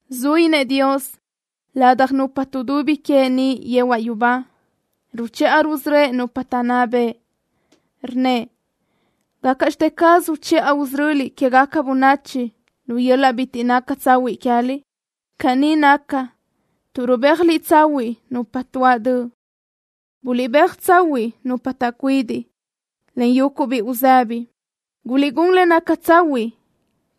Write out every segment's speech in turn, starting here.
Zuínëʼ Dios ladaj nupa tuʼdubi queëʼ niʼ yehuaʼ yubá. Ruchiʼa rusörö́ëʼ nupa taʼnná bëʼ. Rnnëʼ: “¿Gácaʼxte caz uchiʼa usörö́liʼ quégaca bönachi lu yöl-laʼ bitiʼ naca tsahuiʼ queë́liʼ? Caní naca tuʼ rubéajliʼ tsahuiʼ nupa tuáʼ döʼ. Buliʼbéaj tsahuiʼ nupa taʼcuidiʼ, en yuguʼ biʼi uzëbi. Guliʼgún le naca tsahuiʼ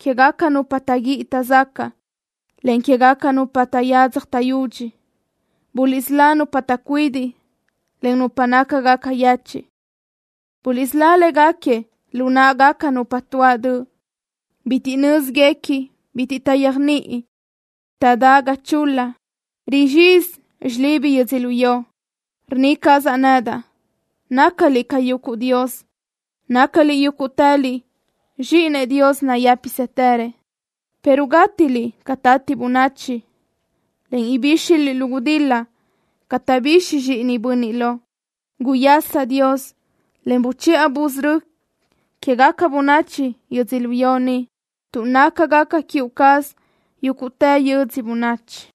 quégaca nupa taʼguíʼi taʼzacaʼ, en quégaca nupa taʼyadzaj taʼyudxi. Buliʼsölá nupa taʼcuidiʼ, en nupa nácagaca yechiʼ. Buliʼsölá léguequi lu náʼagaca nupa tuáʼ döʼ. Bitiʼ nö́ziguequi, en bitiʼ taʼyéajniʼi. Taʼdá ga chul-la. Rizxizi xilibi yödzölió.” Rnna cazaʼ nedaʼ: “Nácaliʼ ca yuguʼ dios. Nácaliʼ yúguʼtëliʼ zxíʼinëʼ Dios nayë́pisëtërëʼ, pero gátiliʼ ca tati bönachi, en ibíxiliʼ lu gudil-la ca taʼbixi zxíʼinëʼ bönniʼ lo.” Guyasa, Dios, en buchiʼa busörö́ quégaca bönachi yödzölió ni, tuʼ nácagaca queë cazuʼ yúguʼtë yödzö bönachi.